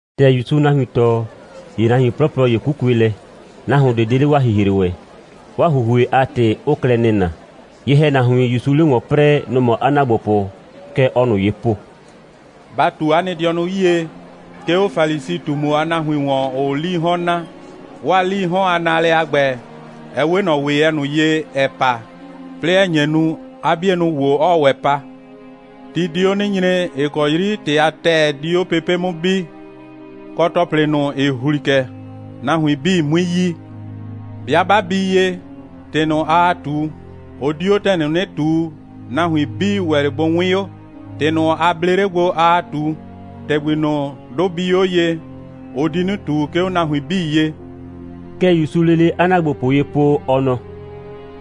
‑Tɛ ‑Yusuu nahuin tɔɔ, ‑ye nahuin 'plɔplɔ ‑ye 'kukue lɛ. Nahuon ꞊de 'de 'le 'waa ‑hihre ‑wɛ. 'Waa ‑huhue a ‑tɩ 'ʋʋ klɛ nɩna. Ye‑hɛnahuin, ‑Yusuu 'le ‑wɔn 'prɛɛ, nʋ‑ mɔ 'a ‑naagbopʋ. Kɛ ɔɔ ꞊nʋ ye po: «Ba ꞊tu 'a nɩ dɩɔnʋ 'yie, 'ke 'o Falisi꞊tumu a nahuin ‑wɔn, ‑ʋʋ 'lii 'hɔn naa. 'Waa 'lii 'hɔn a naalɛ a ‑gbɛ, ɛ 'we ꞊nɔ ‑weyɛ ꞊nʋ ye, ‑ɛ pa, 'plɩɩ ‑ɛ nye nu, 'a 'bienʋ ‑wo 'ɔɔ ‑wɛ pa. Ti di 'o 'nɩ nyre, ‑ɩ kɔ 'yri ‑tɩ a ‑tɛɛ di 'o pepe' 'mʋ bi, kɔ, ‑tɔplɩ ꞊nʋ, ‑ɩ ‑hli kɛ, nahuin 'bii 'mui yi. 'Bɩa 'ba bii ye, ‑tɩ ꞊nʋ, aa ꞊tu, ʋ di 'o ‑tɛ ꞊nʋ 'nɩ ꞊tuu, nahuin 'bii ‑wɛ 'le bʋ 'wɩɩn 'o. ‑Tɩ ꞊nʋ, a blee 'le gbo, aa ꞊tu, ‑tɛgbi ꞊nʋ, 'dʋ bii 'o ye, ʋ di 'nɩ ꞊tu, 'ke 'o nahuin 'bii ye.» (Kɛ ‑Yusuu lele 'a ‑naagbopʋ ye po, ɔ nɔ:)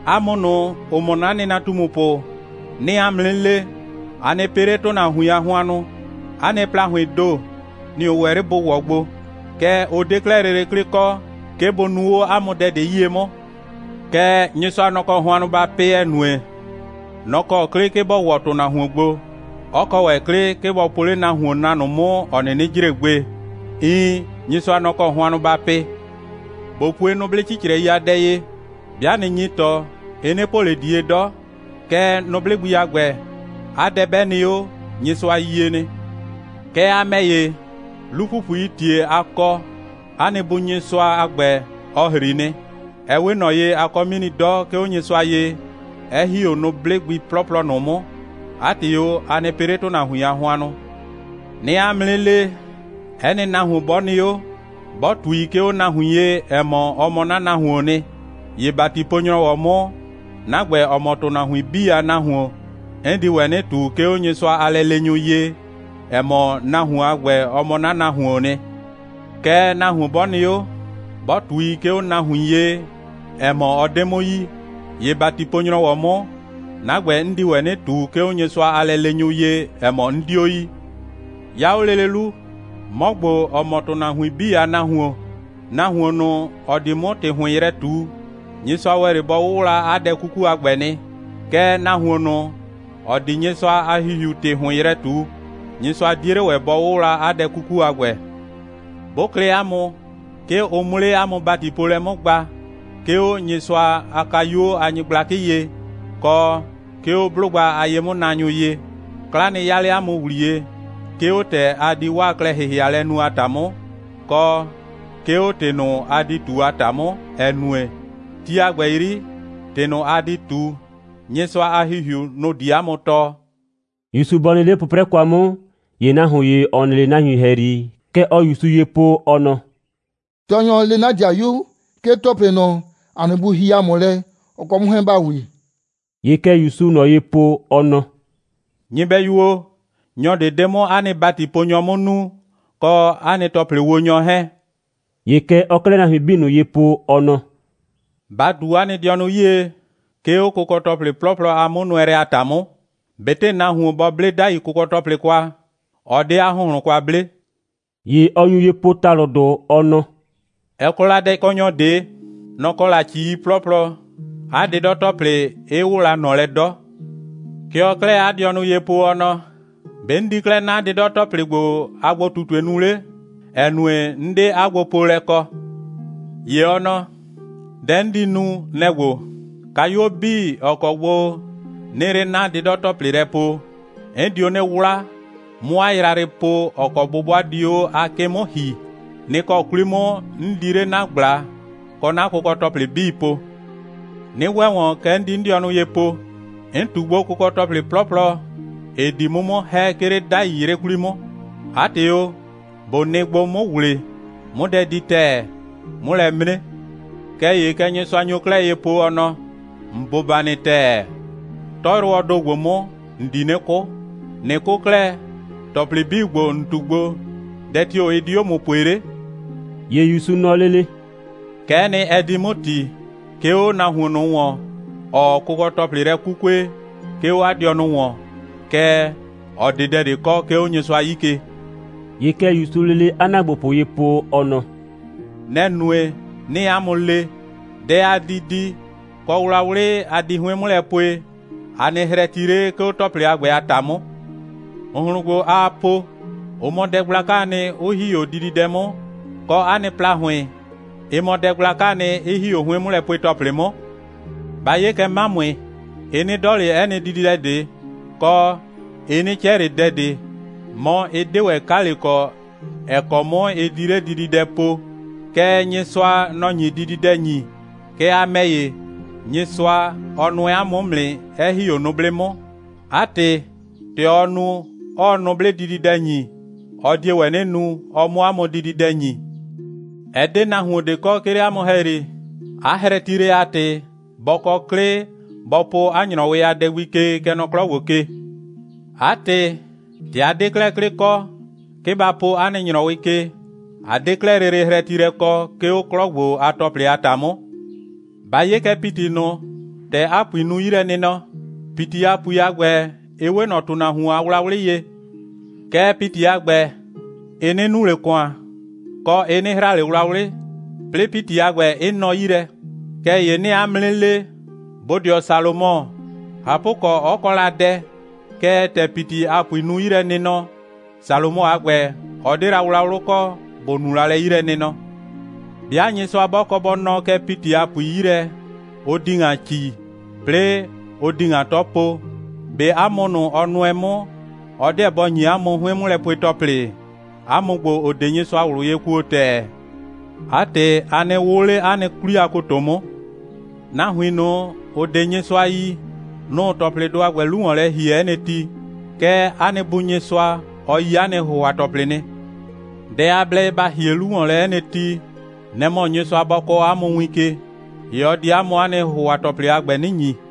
«'A mʋ ꞊nʋ, ‑ʋ mɔ 'na nɩnatumupʋ, 'nɩɩ 'a mʋ 'nɩ le: A nɩ pɩ 'le ‑tʋnahuin a hʋannʋ. 'A nɩ ‑plahʋɩɩn ‑do, nɩ‑ ʋ ‑wɛ 'le bʋ ‑wɔ gbo. Kɛɛ, ʋ 'de 'klɛɛ lele 'klɩ kɔ, 'ke bʋ nuu 'o 'a mʋ dɛ ꞊de 'yie 'mʋ. Kɛɛ, Nyɩsʋa, nɔ‑ kɔ hʋannʋ ba pɩ, ‑ɛ nue, nɔ‑ kɔ 'klɩ, 'ke bɔ ‑wɔ ‑tʋnahuon gbo, 'ɔ kɔ ‑wɛ 'klɩ, 'ke bɔ po 'le nahuon na ꞊nʋ 'mʋ, ‑ɔ 'nɩnɩ jre gbe. Iin, Nyɩsʋa, nɔ‑ kɔ hʋannʋ ba pɩ. ꞊Bo pue nʋblɩ 'cicrɛi a dɛ ye. 'Bɩa ꞊nɩ nyi ‑tɔ, ɩ 'nɩ po ꞊le ꞊die 'dɔ. Kɛɛ, nʋblɩ gbi a ‑gbɛ, 'a dɛ 'bɛ nɩ 'o, Nyɩsʋa yie nɩ. Kɛɛ, a ‑mɛ ‑ye, 'lu‑pupuii ‑tie a kɔ, 'a nɩ Bu Nyɩsʋa a ‑gbɛ, ɔ ‑hri nɩ. Ɛ 'we ꞊nɔ ye, a kɔ 'mini 'dɔ, 'ke 'o Nyɩsʋa ye, 'ɛ ‑hi 'o nʋblɩ gbi 'plɔplɔ ꞊nʋ 'mʋ. 'A ‑tɩ o, a nɩ pɩ 'le ‑tʋnahuin a hʋannʋ!» «'Nɩɩ 'a mʋ 'nɩ le, 'ɛ nɩ nahuon 'bɔ nɩ 'o, 'bɔ ꞊tui, 'ke 'o nahuin ye, ‑ɛ mɔ, ɔ mɔ 'na nahuoon nɩ, ‑ye ‑batipo‑nyrɔwɔ 'mʋ, 'na ‑gbɛ, ‑ɔ mɔ ‑tʋnahuin 'bii a Nahuon, 'n di ‑wɛ 'nɩ ꞊tu, 'ke 'o Nyɩsʋa a lɛleenyʋ ye, ‑ɛ mɔ, nahuon a ‑gbɛ, ɔ mɔ 'na nahuoon nɩ. Kɛɛ, nahuon 'bɔ nɩ 'o, 'bɔ ꞊tui, 'ke 'o nahuin ye, ‑ɛ mɔ, ɔ 'de 'mʋ yi, ‑ye ‑batipo‑nyrɔwɔ 'mʋ, 'na ‑gbɛ, 'n di ‑wɛ 'nɩ ꞊tu, 'ke 'o Nyɩsʋa a lɛleenyʋ ye, ‑ɛ mɔ, 'n 'dio yi. 'Ya 'o lele 'lu, 'mɔ ‑gbo, ‑ɔ mɔ ‑tʋnahuin 'bii a Nahuon, nahuon ꞊nʋ, ‑ɔ di 'mʋ ‑tɩ ‑hʋɩn yrɛ ꞊tu, Nyɩsʋa ‑wɛ 'le bɔ 'wʋwla 'a dɛ 'kuku a ‑gbɛ nɩ. Kɛɛ, nahuon ꞊nʋ, ‑ɔ di Nyɩsʋa a ‑Hihiu ‑tɩ ‑hʋɩn yrɛ ꞊tu, Nyɩsʋa 'die 'le ‑wɛ bɔ 'wʋwla 'a dɛ 'kuku a ‑gbɛ. 'Bʋ klɩ 'a mʋ, 'ke ʋ 'mʋ 'le 'a mʋ ‑batipoolɛ 'mʋ gba, 'ke 'o Nyɩsʋa a kayuo a nyɩgblakɩ ye, kɔ 'ke 'o 'blʋgba a ye'mʋnaanyʋ ye, 'kla nɩ 'ya 'le 'a mʋ ‑wliye, 'ke 'o ‑tɛ a di 'waa klɛ‑hɩhɩalɛ nu a ‑ta 'mʋ, kɔ 'ke 'o ‑tɩ ꞊nʋ, a di ꞊tu a ‑ta 'mʋ, ‑ɛ nue, ti a ‑gbɛ 'yri, ‑tɩ ꞊nʋ, a di ꞊tu, Nyɩsʋa a ‑Hihiu, nʋ‑ di 'a mʋ tɔɔ.» ‑Yusu bɔ nɩ 'le 'pʋprɛ kwa 'mʋ, ‑ye nahuon ‑ye, ‑ɔ nɩ 'le nahuin ‑hɛyri, kɛ ɔɔ ‑Yusu ye po, ɔ nɔ: «Tɔɔnyɔ, le 'na ‑dɩayu, 'ke ‑tɔplɩ ꞊nʋ, ‑a nɩ bu hie ‑a mʋ lɛ, ɔ kɔ 'mʋ 'hɛɛn ‑ba wi.» ‑Ye kɛ ‑Yusuu ꞊nɔ ye po, ɔ nɔ: «Nyɩbɛyu o, nyɔ ꞊de 'de 'mʋ 'a nɩ ‑batiponyɔ 'mʋ nuu, kɔ 'a nɩ ‑tɔplɩwonyɔ 'hɛɛn.» ‑Ye kɛ ɔɔ 'klɛɛ nahuin 'bii ꞊nʋ ye po, ɔ nɔ: «Ba ꞊tu 'a nɩ dɩɔnʋ 'yie, 'ke 'o kʋkɔ‑tɔplɩ 'plɔplɔ a 'mʋnʋɛlɛ a ‑ta 'mʋ. ꞊Betɩ nahuon bɔ 'ble 'dai kʋkɔ‑tɔplɩ kwa, ɔ 'de 'a ‑hʋnhlʋn kwa 'ble.» ‑Ye ɔ nyu ye po ‑talʋdʋ, ɔ nɔ: «Ɛ kɔ la dɛkɔnyɔ ꞊de. Nɔ‑ kɔ la ‑cii 'plɔplɔ, 'a 'dɩdɔ‑tɔplɩ 'ɩ 'wʋʋ la ꞊nɔ lɛ 'dɔ. Kɛ ɔɔ 'klɛɛ 'a dɩɔnʋ ye po, ɔ nɔ: ‑Be' 'n di 'klɛɛ 'na 'dɩdɔ‑tɔplɩ ‑gbo a gbo꞊tutue nu 'le, ‑ɛ nue, 'n 'de 'a gbopoolɛ kɔ. ‑Ye ɔ nɔ: Dɛ 'n di nu, nɛ‑ ‑gbo: Kayuo 'bii, ‑ɔ kɔ gbo 'nɩɩ 'le 'na 'dɩdɔ‑tɔplɩ lɛ poo, 'n dio 'nɩ 'wla, 'mʋ 'a yrayrɩ po, ‑ɔ kɔ 'bʋbʋa di 'o 'a 'kɩ 'mʋ ‑hi. Nɩ‑ kɔ 'kwli 'mʋ 'n di 'le 'na ꞊gbla kɔ 'na kʋkɔ‑tɔplɩ 'bii po. 'Nɩ ‑wɛ ‑wɔn, kɛ 'n di 'n dɩɔnʋ ye po: 'N ꞊tu gbo kʋkɔ‑tɔplɩ 'plɔplɔ, ‑ɩ di 'mʋ 'mʋ ‑hɛ, 'ke 'le 'dai 'yrɩ 'kwli 'mʋ. 'A ‑tɩ o, ꞊bo nɩ gbo, 'mʋ ‑wle, 'mʋ dɛ di ‑tɛɛ, 'mʋ lɛ 'mre. Kɛɛ ‑ye kɛ Nyɩsʋa nyo 'klɛɛ ye po, ɔ nɔ: ‑N bʋba nɩ ‑tɛɛ. 'Tɔyrʋwɔɔ ‑do ‑gbo 'mʋ, ‑n di 'nɩ 'kʋ. ꞊Nɩ 'kʋ 'klɛɛ, ‑tɔplɩ 'bii ‑gbo, ‑n ꞊tu gbo, dɛ tio‑ ɩ di 'o ‑mʋ pue 'le?» ‑Ye ‑Yusu nɔ lele: «Kɛ'ɛ nɩ, ɛ di 'mʋ ‑ti, 'ke 'o nahuon ꞊nʋ ‑wɔn, ‑ɔɔ kʋkɔ‑tɔplɩ lɛ 'kukue, 'ke 'o 'a dɩɔnʋ ‑wɔn, kɛɛ, ‑ɔ 'de dɛ ꞊de kɔ, 'ke 'o Nyɩsʋa 'yi ke.» ‑Ye kɛ ‑Yusuu lele 'a ‑naagbopʋ ye po, ɔ nɔ: «Nɛ‑ nue, 'nɩɩ 'a mʋ le: Dɛ a di di, kɔ wlawlɩ a di 'hʋɩn 'mʋ lɛ pue, a nɩ hrɛti 'le, 'ke 'o ‑tɔplɩ a ‑gbɛ a ‑ta 'mʋ. ‑Hʋnhlʋn ‑gbo, aa po, ʋ mɔ dɛ gblakaa nɩ, 'ʋ ‑hi 'o dididɛ 'mʋ, kɔ, 'a nɩ ‑plahʋɩn, ɩ mɔ dɛ gblakaa nɩ, 'ɩ ‑hi 'o 'hʋɩn'mʋlɛpue‑tɔplɩ 'mʋ. Ba 'ye kɛ 'mamʋɩ. Ɩ 'nɩ 'dɔ ꞊le 'ɛ nɩ dididɛ ꞊de, kɔ, ɩ 'nɩ 'cɛ ꞊le dɛ ꞊de, mɔ, ɩ 'de ‑wɛ 'kale kɔ, ‑ɛ kɔ 'mʋ ɩ di 'le dididɛ po. Kɛɛ, Nyɩsʋa, nɔ‑ nyi dididɛ ‑nyi. Kɛɛ, a ‑mɛ ‑ye, Nyɩsʋa, ɔ nʋɛ 'a mʋ 'mʋ nɩ, 'ɛ ‑hi 'o nʋblɩ 'mʋ. 'A ‑tɩ, ‑tɛ ɔɔ nu, 'ɔɔ nʋblɩ dididɛ ‑nyi, ɔ die ‑wɛ 'nɩ nu, ɔ 'mʋ 'a mʋ dididɛ ‑nyi. Ɛ 'de nahuon ꞊de kɔ, 'ke 'le 'a mʋ ‑hɛyri, 'a hrɛtilɛ a ‑tɩ, ‑bɔ kɔ 'klɩ, ‑bɔ po 'a ‑nyrɔwɩ a dɛ gbi ke, kɛ nɔ 'klɔ ‑gbo ke. 'A ‑tɩ, ‑tɛ a 'de 'klɛɛ 'klɩ kɔ, 'ke ba po 'a nɩ ‑nyrɔwɩ ke, a 'de 'klɛɛ lele hrɛtilɛ kɔ, 'ke 'o 'klɔ ‑gbo a ‑tɔplɩ a ‑ta 'mʋ. Ba 'ye kɛ ‑piti ꞊nʋ, ‑tɛ 'a ‑pui nu 'yilɛnɩnɔ. ‑Piti a ‑pui a ‑gbɛ, ɩ 'we ꞊nɔ ‑tʋnahuon a wlawlɩ ye. Kɛɛ, ‑piti a ‑gbɛ, ɩ 'nɩ nu ꞊le ‑kʋan, kɔ, ɩ 'nɩ hra ꞊le wlawlɩ, 'plɩɩ ‑piti a ‑gbɛ 'ɩ nɔ 'yi lɛ. Kɛɛ ‑ye 'nɩɩ 'a mʋ 'nɩ le, bodɩɔ Salomɔ, ꞊hapʋkɔ, 'ɔ kɔ la dɛ, kɛɛ, ‑tɛ ‑piti a ‑pui nu 'yilɛnɩnɔ, Salomɔ a ‑gbɛ, ɔ 'de la 'a wlawlʋ kɔ, ‑bʋ nu la lɛ 'yilɛnɩnɔ. 'Bɩa Nyɩsʋa 'bɔ kɔ bɔ nɔɔ kɛ ‑piti a ‑pui 'yi lɛ, ʋ di ‑ŋa ‑ci, 'plɩɩ ʋ di ‑ŋa 'tɔ po, ꞊be 'a mʋ ꞊nʋ, ɔ nʋɛ 'mʋ, ɔ 'deɛ bɔ ‑nyi 'a mʋ 'hʋɩn'mʋlɛpue‑tɔplɩ? 'A mʋ ‑gbo, ‑ʋ 'de Nyɩsʋa ꞊wlʋ ye kuo ‑tɛɛ. 'A ‑tɩ, a nɩ 'wʋʋ 'le 'a nɩ 'kwli a ‑koto 'mʋ. Nahuin ꞊nʋ, ‑ʋ 'de Nyɩsʋa yi, nʋ‑ʋ ‑tɔplɩdʋ a ‑gbɛ 'lu ‑wɔn lɛ ‑hie 'ɛ nɩ ti. Kɛɛ, 'a nɩ Bu Nyɩsʋa, ɔ yi 'a nɩ ‑hʋhʋa‑tɔplɩ nɩ. Dɛ a blɛ ye ba ‑hie 'lu ‑wɔn lɛ 'ɛ nɩ ti, nɛ‑ mɔ, Nyɩsʋa bɔ kɔɔ 'a mʋ win ke, ‑ye ɔ di 'a mʋ 'a nɩ ‑hʋhʋa‑tɔplɩ a ‑gbɛ 'nɩ ‑nyi.»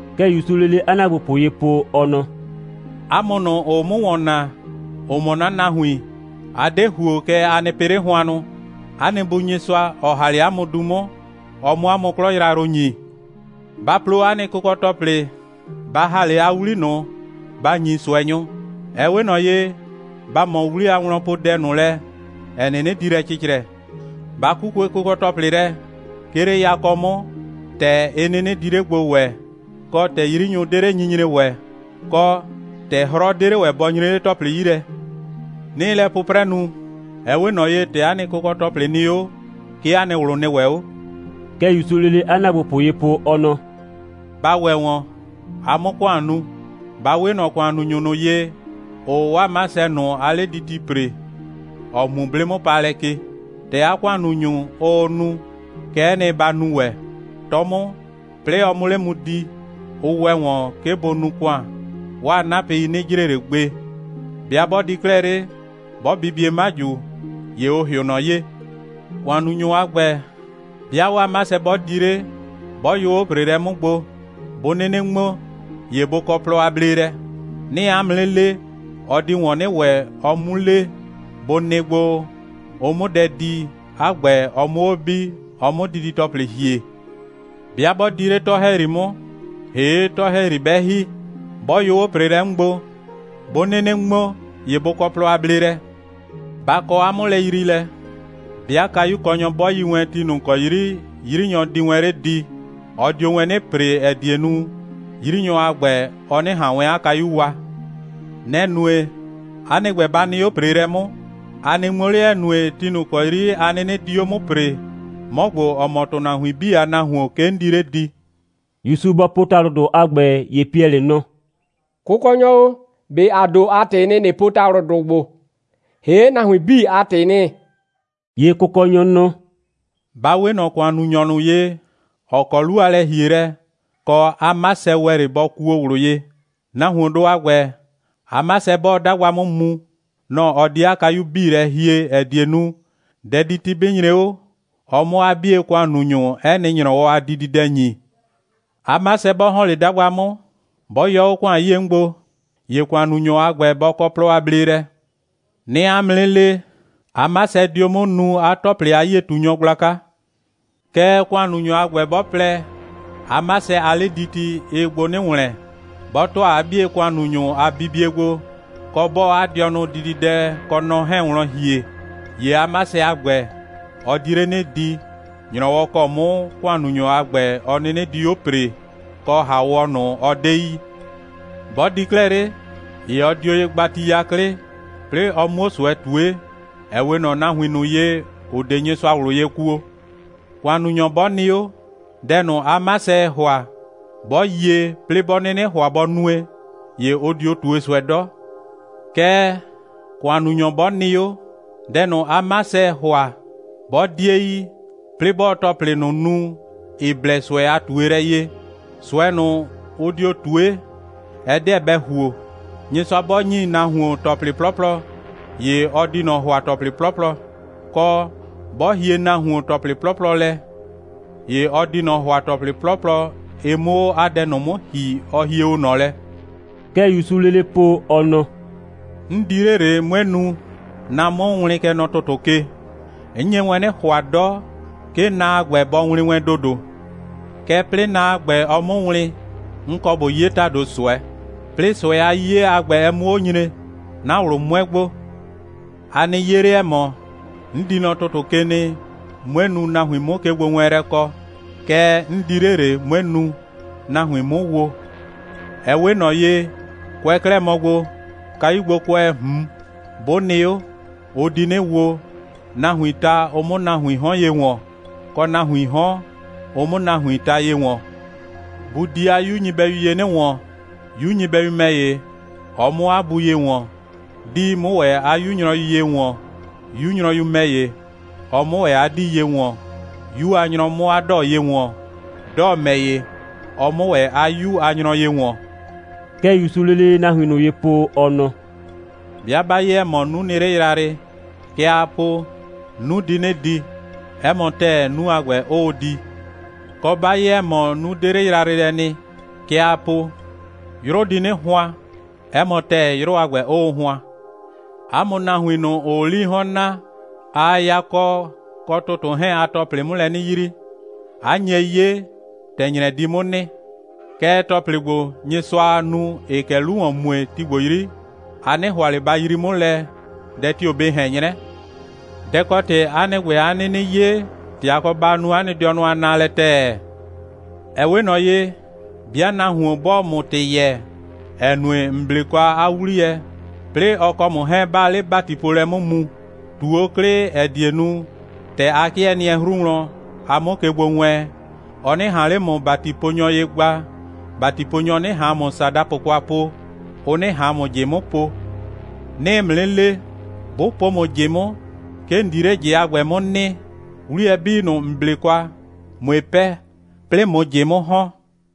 (Kɛ ‑Yusuu lele 'a ‑naagbopʋ ye po, ɔ nɔ:) «'A mʋ ꞊nʋ, ‑ʋʋ 'mʋ ‑wɔn naa, ‑ʋ mɔ 'na nahuin, a 'de ‑huo, kɛɛ, a nɩ pɩ 'le hʋannʋ. 'A nɩ Bu Nyɩsʋa, ɔ ‑ha 'le 'a mʋ 'mʋ du, ɔ 'mʋ 'a mʋ 'a 'klɔ yrayrʋ ‑nyi. Ba plo 'a nɩ kʋkɔ‑tɔplɩ, ba ‑ha 'le 'a 'wli ꞊nʋ, ba ‑nyi ꞊sʋɛnyʋ. Ɛ 'we ꞊nɔ ye, ba ꞊mɔ 'wli a wlɔnpoodɛ ꞊nʋ lɛ, ‑ɛ 'nɩnɩ di lɛ cɩcrɛ. Ba 'kukue kʋkɔ‑tɔplɩ lɛ, 'ke 'le yakɔ 'mʋ, ‑tɛ ɩ 'nɩnɩ di 'le gbo ‑wɛɛ, kɔ, ‑tɛ 'yrinyʋ 'de 'le nyinyre ‑wɛ, kɔ, ‑tɛ 'hrɔ 'de 'le ‑wɛ bɔ nyree 'le ‑tɔplɩ 'yi lɛ. 'Nɩɩ lɛ 'pʋprɛ nu, ɛ 'we ꞊nɔ ye, ‑tɛ 'a nɩ kʋkɔ‑tɔplɩ nɩ 'o, 'ke 'a nɩ ꞊wlʋ nɩ ‑wɛ 'o.» (Kɛ ‑Yusuu lele 'a ‑naagbopʋ ye po, ɔ nɔ:) «Ba ‑wɛ ‑wɔn, a 'mʋ ‑kʋan nu. Ba 'we ꞊nɔ ‑kʋannunyʋ ꞊nʋ ye, ‑ʋʋ 'waa 'masɛ ꞊nʋ a 'lediti ‑pre, ‑ɔ mu 'blɩ'mʋpaalɛ ke. ‑Tɛ 'a ‑kʋannunyʋ, ʋʋ nu, kɛ'ɛ nɩ, ba nu ‑wɛ. 'Tɔ 'mʋ, 'plɩɩ ɔ 'mʋ 'le di, ʋ ‑wɛ ‑wɔn, 'ke bʋ nu ‑kʋan, 'waa 'napɩi 'nɩ jre ꞊le gbe. 'Bɩa 'bɔ di 'klɛɛ 'le, 'bɔ bibie 'maju, ‑ye ʋ ‑hɩʋ ꞊nɔ ye. ‑Kʋannunyʋ a ‑gbɛ, 'bɩa 'waa 'masɛ 'bɔ di 'le, 'bɔ yʋ 'o ‑preelɛ 'mʋ gbo, 'bʋ 'nɩnɩ ŋmo, ‑ye bʋ kɔ plɔ a bleelɛ. 'Nɩɩ 'a mʋ 'nɩ le, ɔ di ‑wɔn 'nɩ ‑wɛ, ɔ 'mu le, bʋ nɩ gbo, ʋ 'mʋ dɛ di, 'a ‑gbɛ, ɔ 'mʋ 'o bi, ɔ 'mʋ didi‑tɔplɩ ‑hie. 'Bɩa 'bɔ di 'le 'tɔ‑hɛyri 'mʋ, ‑hee' 'tɔ‑hɛyri 'bɛ ‑hi, 'bɔ yʋ 'o ‑preelɛ 'mʋ gbo, 'bʋ 'nɩnɩ ŋmo, ‑ye bʋ kɔ plɔ a bleelɛ. Ba kɔ 'a 'mʋlɛyriilɛ: 'bɩa kayukɔnyɔ 'bɔ yi wɛn ti ꞊nʋ ‑kɔ 'yri 'yrinyɔ di wɛn 'le di, ɔ dio wɛn 'nɩ ‑pre, ‑ɛ die nu, 'yrinyɔ a ‑gbɛ, ɔ 'nɩ ꞊han wɛn 'a kayu wa. Nɛ‑ nue, 'a nɩ ‑gbɛ, ba nɩ 'o ‑preelɛ 'mʋ, a nɩ ŋmo 'le, ‑ɛ nue, ti ꞊nʋ kɔ 'yri a 'nɩnɩ di 'o 'mʋ ‑pree, 'mɔ ‑gbo, ‑ɔ mɔ ‑tʋnahuin 'bii a Nahuon, 'ke 'n di 'le di.» ‑Yusu bɔ po ‑talʋdʋ a ‑gbɛ, ‑ye Piɛlɩ nɔ: «Kʋkɔnyɔ o, ꞊be ‑a ‑do a ‑tɩɩ nɩ, ꞊nɩ po ‑talʋdʋ ‑gbo, ‑hee', nahuin 'bii a ‑tɩɩ nɩ?» ‑Ye Kʋkɔnyɔ nɔ: «Ba 'we ꞊nɔ ‑kʋannunyɔ ꞊nʋ ye, ‑ɔ kɔ 'lu a lɛ‑hielɛ, kɔ, 'a 'masɛ ‑wɛ 'le bɔ kuo ꞊wlʋ ye. Nahuondʋ a ‑gbɛ, 'a 'masɛ, 'bɔɔ 'dagba 'mʋ mu, nɔ‑ ɔ di 'a kayu 'bii lɛ hie, ‑ɛ die nu, dɛditi 'bɩ nyre 'o, ɔ 'mʋ 'a 'bie ‑kʋannunyʋ 'ɛ nɩ ‑nyrɔwɔ a dididɛ ‑nyi. 'A 'masɛ 'bɔ ‑hɔn 'le 'dagba 'mʋ, 'bɔ yɔ 'o ‑kʋan 'yie 'mʋ gbo, ‑ye ‑kʋannunyɔ a ‑gbɛ, bɔ kɔ plɔ a bleelɛ. 'Nɩɩ 'a mʋ 'nɩ le, 'a 'masɛ dio 'mʋ nuu 'a ‑tɔplɩ a 'yie꞊tunyɔ gblaka. Kɛɛ, ‑kʋannunyɔ a ‑gbɛ 'bɔ plɛ, 'a 'masɛ a 'lediti, ɩɩ gbo 'nɩ ‑wlɛn, 'bɔ ‑tʋa 'a 'bie ‑kʋannunyʋ a bibie gbo, kɔ, 'bɔɔ 'a dɩɔnʋ dididɛ kɔ nɔ 'hɛɛn wlɔn ‑hie, ‑ye 'a 'masɛ a ‑gbɛ, ɔ di 'le 'nɩ di, ‑nyrɔwɔ ‑kɔ 'mʋ ‑kʋannunyɔ a ‑gbɛ, ɔ 'nɩnɩ dio 'o ‑pree, kɔ ‑haawɔ ꞊nʋ, ɔ 'de yi. 'Bɔ di 'klɛɛ 'le, ‑ye ɔ dio ye gba ti 'yaklɩ, 'plɩɩ ɔ 'muo ꞊sʋɛ ꞊tue, ‑ɛ 'we ꞊nɔ nahuin ꞊nʋ ye, ‑ʋ 'de Nyɩsʋa ꞊wlʋ ye kuo. ‑Kʋannunyɔ 'bɔ nɩ 'o, dɛ ꞊nʋ, 'a 'masɛɛ ‑hʋa, 'bɔ yie, 'plɩɩ 'bɔ 'nɩnɩ ‑hʋa bɔ nue, ‑ye ʋ dio ꞊tue ꞊sʋɛ 'dɔ. Kɛɛ, ‑kʋannunyɔ 'bɔ nɩ 'o, dɛ ꞊nʋ, 'a 'masɛɛ ‑hʋa, 'bɔ 'die yi, 'plɩɩ 'bɔɔ ‑tɔplɩ ꞊nʋ nu, ‑ɩ blɛ ꞊sʋɛ a ꞊tuelɛ ye, ꞊sʋɛ ꞊nʋ, ʋ dio ꞊tue, ɛ 'deɛ bɛ ‑huo. Nyɩsʋa 'bɔ ‑nyi nahuon ‑tɔplɩ 'plɔplɔ, ‑ye ɔ di ꞊nɔ ‑hʋa ‑tɔplɩ 'plɔplɔ, kɔ, 'bɔ hie nahuon ‑tɔplɩ 'plɔplɔ lɛ, ‑ye ɔ di ꞊nɔ ‑hʋa ‑tɔplɩ 'plɔplɔ, ɩ 'mʋ 'o 'a dɛ ꞊nʋ 'mʋ ‑hi, ɔ hie o ꞊nɔ lɛ.» Kɛ ‑Yusuu lele po, ɔ nɔ: «'N di 'le ꞊le, 'mue nu, na 'mʋ wlɩn, kɛ nɔ ‑tʋtʋ ke. 'N nye wɛn 'nɩ ‑hʋa 'dɔ, 'ke na a ‑gbɛ bɔ wlɩn wɛn ‑dodo. Kɛɛ, 'plɩɩ na a ‑gbɛ, ɔ 'mʋ wlɩn, 'n kɔ ꞊bo 'ye ‑tado ꞊sʋɛ. 'Plɩɩ ꞊sʋɛ a 'yiye a ‑gbɛ, ɛ 'mʋ 'o nyre, 'na ꞊wlʋ 'mʋɛ gbo. A nɩ 'ye 'le, ‑ɛ mɔ 'n di nɔ ‑tʋtʋ ke nɩ, 'mue nu, nahuin 'mʋ kegbowɛɛnlɛ kɔ. Kɛɛ, 'n di 'le ꞊le, 'mue nu, nahuin 'mʋ wo. Ɛ 'we ꞊nɔ ye, kʋɛ 'klɛɛ mɔ gbo, kayugbokʋɛɛ ꞊hun 'bʋ nɩ 'o, ʋ di 'nɩ wo, nahuiin ta, ʋ 'mʋ nahuiin 'hɔn ye ‑wɔn. kɔ, nahuiin 'hɔn, ʋ 'mʋ nahuiin ta ye ‑wɔn. Bu di 'a 'yu nyɩbɛyu ye 'nɩ ‑wɔn, 'yu nyɩbɛyu ‑mɛ ‑ye, ɔ 'mʋ 'a bu ye ‑wɔn; 'dii 'mʋ ‑wɛ 'a 'yu nyrɔyu ye ‑wɔn, 'yu nyrɔyu ‑mɛ ‑ye, ɔ 'mʋ ‑wɛ 'a 'dii ye ‑wɔn; 'yu a nyrɔ 'mʋ 'a 'dɔɔ ye ‑wɔn, 'dɔɔ ‑mɛ ‑ye, ɔ 'mʋ ‑wɛ 'a 'yu a nyrɔ ye ‑wɔn.» Kɛ ‑Yusuu lele nahuin ꞊nʋ ye po, ɔ nɔ: «'Bɩa 'ba 'ye, ‑ɛ mɔ 'nu nɩ 'le yrayrɩ, kɛ aa po: 'Nu di 'nɩ di. 'Ɛ mɔ ‑tɛɛ, 'nu a ‑gbɛ 'ʋʋ di. Kɔ, 'ba 'ye, ‑ɛ mɔ 'nu 'de 'le yrayrɩ lɛ nɩ, kɛ aa po: 'Yrʋ di 'nɩ hʋan. 'Ɛ mɔ ‑tɛɛ, 'yrʋ a ‑gbɛ 'ʋʋ hʋan. 'A mʋ nahuin ꞊nʋ, ‑ʋʋ 'lii 'hɔn naa, aa yakɔ kɔ ‑tʋtʋ 'hɛɛn a ‑tɔplɩ 'mʋ lɛ 'nɩ yrii, 'a nye 'ye, ‑tɛ ‑nyrɛ di 'mʋ nɩ. Kɛɛ, ‑tɔplɩ ‑gbo, Nyɩsʋaa nu, ‑ɩɩ kɛ 'lu ‑wɔn mue, ti ‑gbo 'yri, a 'nɩ ‑hʋa ꞊le ba yrii 'mʋ lɛ, dɛ tio‑ bɩ ꞊hɛn 'nyrɛ. Dɛ‑ kɔ ‑tɩ 'a nɩ ‑gbɛ 'a 'nɩnɩ 'ye, ‑tɛ a kɔ ba nu 'a nɩ dɩɔnʋ a naalɛ ‑tɛɛ? Ɛ 'we ꞊nɔ ye, 'bɩa nahuon 'bɔɔ ‑mʋ ‑tɩ yɛɛ, ‑ɛ nue, ‑n 'ble kwa 'a 'wliyɛ, 'plɩɩ ɔ kɔ ‑mʋ 'hɛɛn, 'baa 'le ‑batipoolɛ 'mʋ mu, ꞊tu 'o 'klɩ, ‑ɛ die nu, ‑tɛ a 'kɩɛ nɩɛ 'hru wlɔn, a 'mʋ ke gbo wɛɛn, ɔ 'nɩ ꞊han 'le ‑mʋ ‑batiponyɔ ye gba, ‑batiponyɔ 'nɩ ꞊han ‑mʋ ‑sadapʋ kwa po, ʋ 'nɩ ꞊han ‑mʋ ꞊jɩ 'mʋ po. 'Nɩɩ ‑mʋ 'nɩ le, 'bʋ po ‑mʋ ꞊jɩ 'mʋ, 'ke ‑n di 'le ꞊jɩ a ‑gbɛ 'mʋ nɩ, 'wliyɛ 'bii ꞊nʋ, ‑n 'ble kwa, ꞊mue 'pɛɛ, 'plɩɩ ꞊mʋ ꞊jɩ 'mʋ ‑hɔn.»